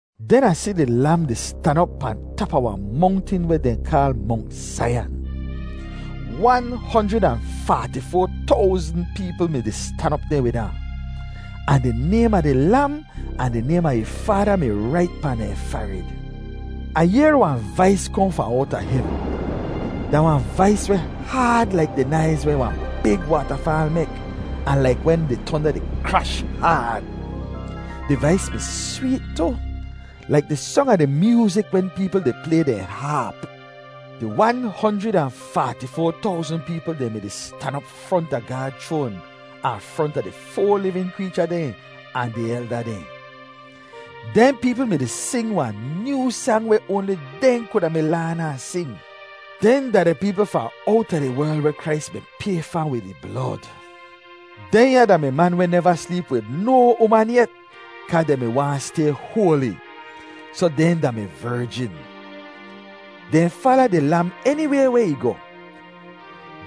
Den Ah si di Lam di stan op pahn tap a wahn mongtin weh dehn kaal Mongt Zaiyan. Wan honjrid ahn faati-foa towzn peepl mi-di stan op deh wid ahn. Ahn di naym a di Lam ahn di naym a ih Faada mi rait pahn dehn farid. Ah yehr wahn vais kohn fahn owta hevn. Da wahn vais weh haad laik di naiz weh wahn big waatafaal mek ahn laik wen di tonda di krash haad. Di vais mi sweet tu, laik di song a di myoozik wen peepl di play dehn haap. Di wan honjrid ahn faati-foa towzn peepl dehn mi-di stan op fronta Gaad chroan ahn fronta di foa livin kreecha dehn ahn di elda dehn. Dehn peepl mi-di sing wahn nyoo sang weh oanli dehn kuda mi laan ahn sing. Dehn da di peepl fahn owta di werl weh Krais mi pay fa wid ih blod. Dehnya da-mi man weh neva sleep wid no uman yet, kaa dehn mi waahn stay hoali; soh dehn da-mi verjin. Dehn fala di Lam eniway weh ih goh.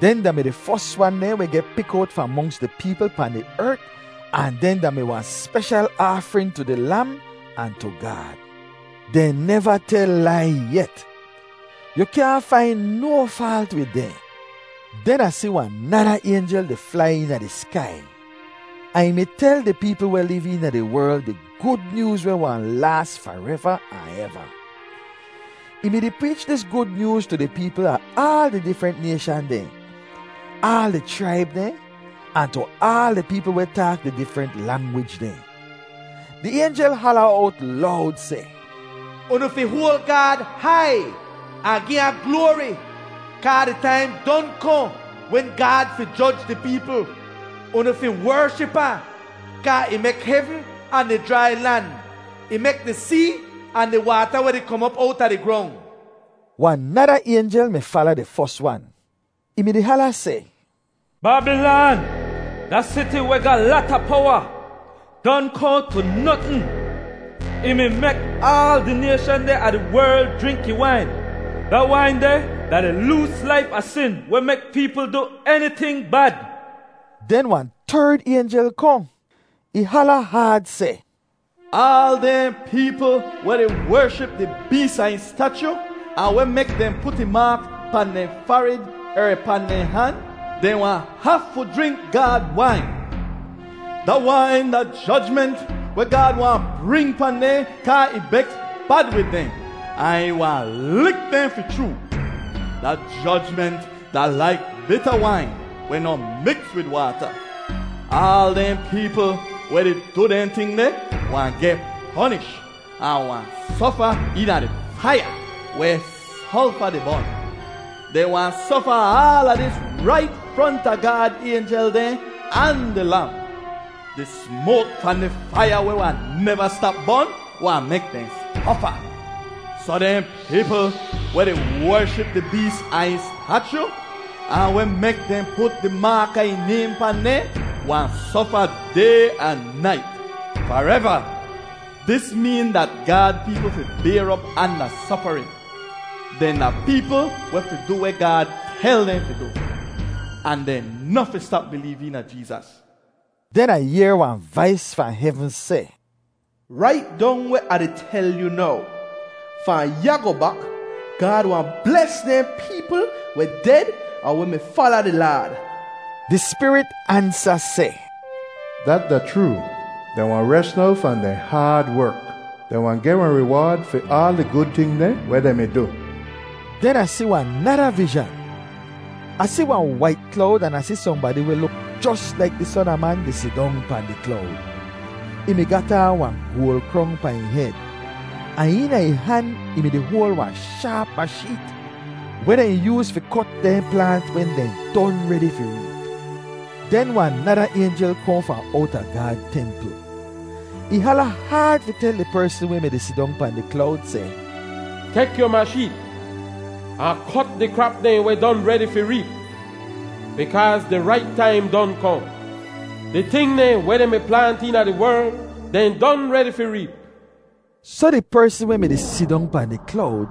Dehn da-mi di fos wan dehn weh geh pik owt fahn monks di peepl pahn di ert ahn dehn da-mi wahn speshal aafrin tu di Lam ahn tu Gaad. Dehn neva tel lai yet. Yu kyaahn fain no faalt wid dehn. Den Ah si wahn nada aynjel di flai eena di skai, ahn ih mi tel di peepl weh liv eena di werl di Gud Nyooz weh wahn laas fareva ahn eva. Ih mi-di preech dis Gud Nyooz tu di peepl a aal di difrent nayshan dehn, aal di chraib dehn, ahn tu aal di peepl weh taak di difrent langwij dehn. Di aynjel hala owt lowd seh, “Unu fi hoal Gaad hai ahn gi ahn gloari. Kaa di taim don kohn wen Gaad fi joj di peepl. Unu fi wership ahn, kaa ih mek hevn ahn di jrai lan. Ih mek di see ahn di waata weh di kom op owta di grong!” Wahn nada aynjel mi fala di fos wan. Ih mi-di hala seh, “Babilan, da siti weh ga lata powa, don kohn tu notn. Ih mi mek aal di nayshan dehn a di werl jrink ih wain. Da wain deh da di loos laif a sin weh mek peepl du eniting bad.” Den wahn terd aynjel kohn. Ih hala haad seh, “Aal dehn peepl weh di wership di bees ahn ih stachu ahn weh mek dehn put ih maak pahn dehn farid er pahn dehn han, dehn wahn hafu jrink Gaad wain. Da wain da jojment weh Gaad wahn bring pahn dehn kaa ih beks bad wid dehn, ahn ih wahn lik dehn fi chroo. Da jojment da laik bita wain weh noh miks wid waata. Aal dehn peepl weh di du dehn ting deh wahn geh ponish ahn wahn sofa eena di faiya weh solfa di bon. Dehn wahn sofa aala dis rait fronta Gaad aynjel dehn ahn di Lam. Di smoak fahn di faiya weh wahn neva stap bon wahn mek dehn sofa. Soh dehn peepl weh di wership di bees ahn ih stachu, ahn weh mek dehn put di maak a ih naym pahn dehn, wahn sofa day ahn nait, fareva.” Dis meen dat Gaad peepl fi bayr op anda sofarin. Dehn da peepl weh fi du weh Gaad tel dehn fi du ahn dehn noh fi stap bileev eena Jeezas. Den Ah yehr wahn vais fahn hevn seh, “Rait dong weh Ah di tel yu now: Fahn ya goh bak, Gaad wahn bles dehn peepl weh ded ahn weh mi fala di Laad!” Di Spirit ansa seh, “Dat da chroo. Dehn wahn res now fahn dehn haad werk. Dehn wahn geh wahn riwaad fi aal di gud ting dehn weh dehn mi du.” Den Ah si wahn nada vizhan. Ah si wahn wait klowd an Ah si sohnbadi weh luk jos laik di Son a Man di sidong pahn di klowd. Ih mi gat aan wahn goal krong pahn ih hed, ahn eena ih han ih mi-di hoal wahn shaap masheet weh dehn yooz fi kot dehn plaant wen dehn don redi fi reep. Den wahn nada aynjel kohn fahn owta Gaad templ. Ih hala haad fi tel di persn weh mi-di sidong pahn di klowd, seh, “Tek yu masheet ahn kot di krap dehn weh don redi fi reep. Bikaaz di rait taim don kohn. Di ting dehn weh dehn mi plaant eena di werl dehn don redi fi reep.” Soh di persn weh mi-di sidong pahn di klowd,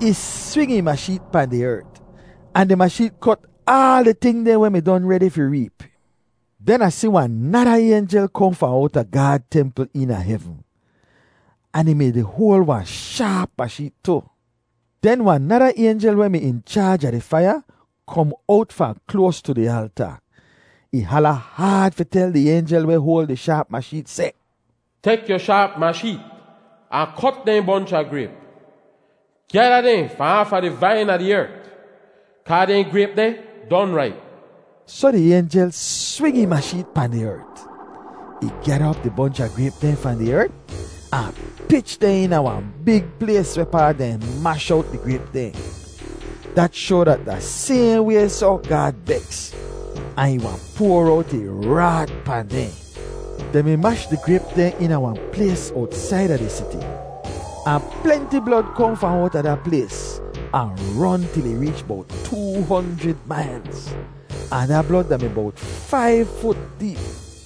ih swing ih masheet pahn di ert, ahn di masheet kot aal di ting dehn weh mi don redi fi reep. Den Ah si wahn nada aynjel kohn fahn owta Gaad templ eena hevn. Ahn ih mi-di hoal wahn shaap masheet tu. Den wahn nada aynjel weh mi in chaaj a di faiya, kom owt fahn kloas tu di alta. Ih hala haad fi tel di aynjel weh hoal di shaap masheet, seh, “Tek yu shaap masheet ahn kot dehn bonch a grayp. Gyada dehn fahn aafa di vain a di ert, kaa dehn grayp deh don raip.” Soh di aynjel swing ih masheet pahn di ert. Ih gyada op di bonch a grayp dehn fahn di ert, ahn pich dehn eena wahn big plays wehpaa dehn mash owt di grayp dehn. Dat shoa dat da sayhn way soh Gaad beks, ahn ih wahn poar owt ih raat pahn dehn. Dehn mi mash di grayp dehn eena wahn plays owtsaida di siti. Ahn plenti blod kohn fahn owta da plays ahn ron til ih reech bowt too honjrid mailz. Ahn da blod da-mi bowt faiv fut deep.